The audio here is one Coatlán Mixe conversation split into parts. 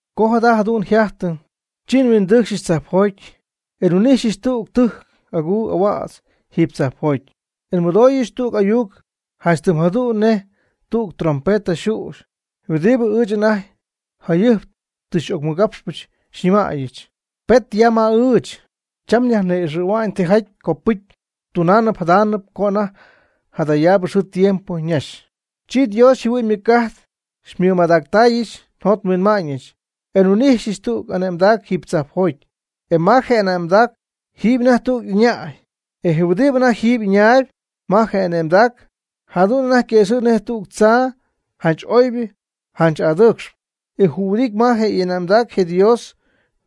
Co jada jadu'n yjajtɨ, chi nhuindɨɨcxyɨch tzajpjoty, e nhuin'ijxyɨch tüg tɨjc aguu ahuädz jiiby tzajpjoty. E nmɨdooyɨch tüg ayuc janch tɨm jadu'n nej tüg trompeta yxüxy huɨdibɨ ɨɨch anajty jayɨjp tɨ xy'ocmɨgapxpɨ, xyñɨmäyɨch: ―Pet ya ma ɨɨch, cham nyajni'ixɨ̈hua'ñ tijaty copɨcy tunaanɨp jadaanɨp co anajty jadayaabɨ xɨɨ tiempo ñaxy. Chi Dios yjɨhuɨ'ñ ymɨc'ajt xymɨmadactaayɨch njot nhuinma'ñɨch, e nhuin'ijxyɨch tüg ane'mdac jiiby tzajpjoty. E ma je ane'mdac jɨm anajty tüg ɨñäy. E je huɨdibɨ anajty jɨm ɨñaayb ma je ane'mdac, jadu'n anajty yquëxɨ̈gy nej tüg tzaa janch oybɨ janch adɨɨcxp. E jühuɨdity ma je ane'mdac je Dios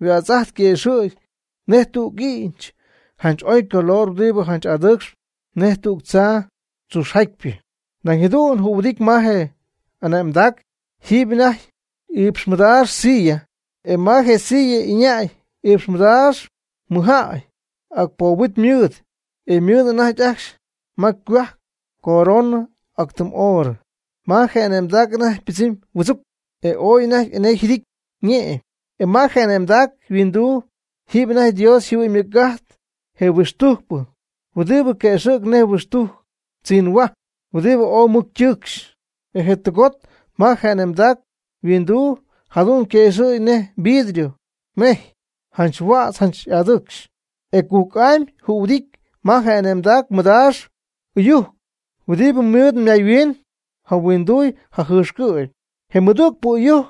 yhuätz'ajt quëxɨ̈gy nej tüg i'ñch janch oycolor huɨdibɨ janch adɨɨcxp nej tüg tzaa tzuxjatypɨ. Nañ jadu'n jühuɨdity ma je ane'mdac jiiby anajty iipx madaax silla, e ma je silla ɨñäy iipx madaax mɨjjäy, ac poob huit mɨɨd. E ymɨɨd anajty ajcxy ma ycohuajc coronɨ ac tɨm oorɨ. Ma je ane'mdac anajty ypɨdzɨmy huɨdzuc, e ooy anajty enee yjɨdijtɨn ñe'my. E ma je ane'mdac huinduu jiiby anajty Dios yjɨhuɨ'ñ ymɨc'ajt je huixtujcpɨ, huɨdibɨ quëxɨ̈g nej huixtujc tzinhuaty huɨdibɨ ooy mɨc ytɨɨcxy. E je tɨgot ma je ane'mdac huinduu jadu'n quëxɨ̈gy nej vidrio mejy, janch huädz janch adɨɨcxp. E cujc'amy jühuɨdity ma je ane'mdac mɨdaax ɨyujc huɨdibɨ mɨɨd mayhuiin jahuinduuy jajɨxcɨ̈py. Je mɨdügpɨ ɨyujc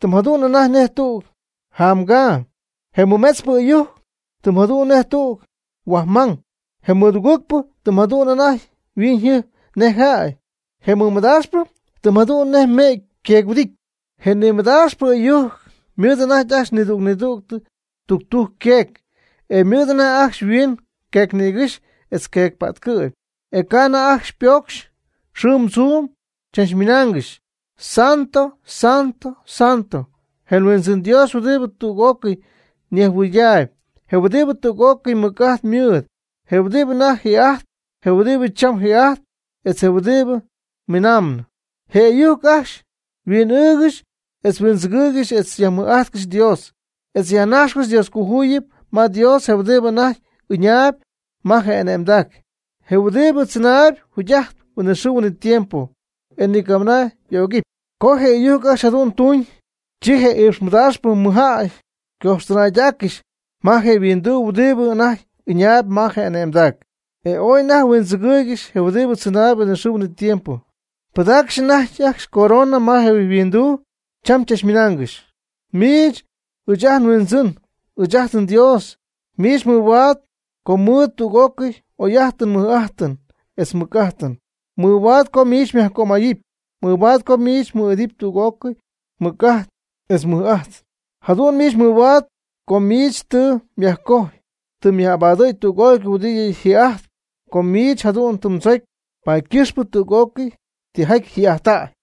tɨm jadu'n anajty nej tüg jamgaa. Je mɨmetzpɨ ɨyujc tɨm jadu'n nej tüg huajmang. Je mɨdugɨɨgpɨ tɨm jadu'n anajty yhuiñyjɨjp nej jäy. Je mɨmadaaxpɨ tɨm jadu'n nej me'ty yqueec-huɨdityɨn. Je nimɨdaaxpɨ ɨyujc ymɨɨd anajty ajcxy nidüg nidüg tudujc yqueec, e ymɨɨd anajty ajcxy yhuiin queecnïgɨ́xy etz queecpa'tcɨ'py. E ca' anajty ajcxy ypocxy xɨɨm tzuum, chachmɨnaangɨxy: Santo, Santo, Santo, je Huindzɨn Dios huɨdibɨ tüg'ócɨy nejhuɨydaayb, huɨdibɨ tüg'ócɨy mɨc'ajt mɨɨd, je huɨdibɨ anajty ji'ajtp, je huɨdibɨ cham ji'ajtp, etz je huɨdibɨ miinaamb. Je ɨyujc ajcxy huin'ɨɨgɨxy etz huindzɨgɨɨygɨxy etz yajmɨj'ajtcɨxy Dios, etz yajnajxcɨxy Dioscojuyipy ma Dios je huɨdibɨ anajty ɨñaayb ma je ane'mdac, je huɨdibɨ tzɨnaayb jugy'ajtp huinɨxɨɨ huinɨtiempo, e ni camɨna y'ögɨpy. Co je ɨyujc ajcxy jadu'n ytuñ, chi je iipx madaaxpɨ mɨjjäy ycojxtɨnaydaaccɨxy ma je' yhuinduu huɨdibɨ anajty ɨñaayb ma je ane'mdac. E ooy anajty huindzɨgɨɨygɨxy je huɨdibɨ tzɨnaayb huinɨxɨɨ huinɨtiempo. Pɨdaaccɨxy anajty ajcxy ycorona ma je' yhuinduu, cham chachmɨnaangɨxy: Miich, ɨɨch ajt nHuindzɨn, ɨɨch ajt nDios, miich mɨhuaad co mmɨɨdɨty tüg'ócɨy oy'ajtɨn mɨj'ajtɨn etz mɨc'ajtɨn, mɨhuaad co miich nyajcömayɨp, mɨhuaad co miich mɨɨd'ity tüg'ócɨy mɨc'ajt etz mɨj'ajt. Jadu'n miich mɨhuaad, com miich tɨ myajcojy, tɨ myaj'abadɨ̈y tüg'ócɨy huɨdibɨ ji'ajtp. Com miich jadu'n tɨ mdzocy, paady ycɨxpɨ tüg'ócɨy tijaty ji'ajttäy.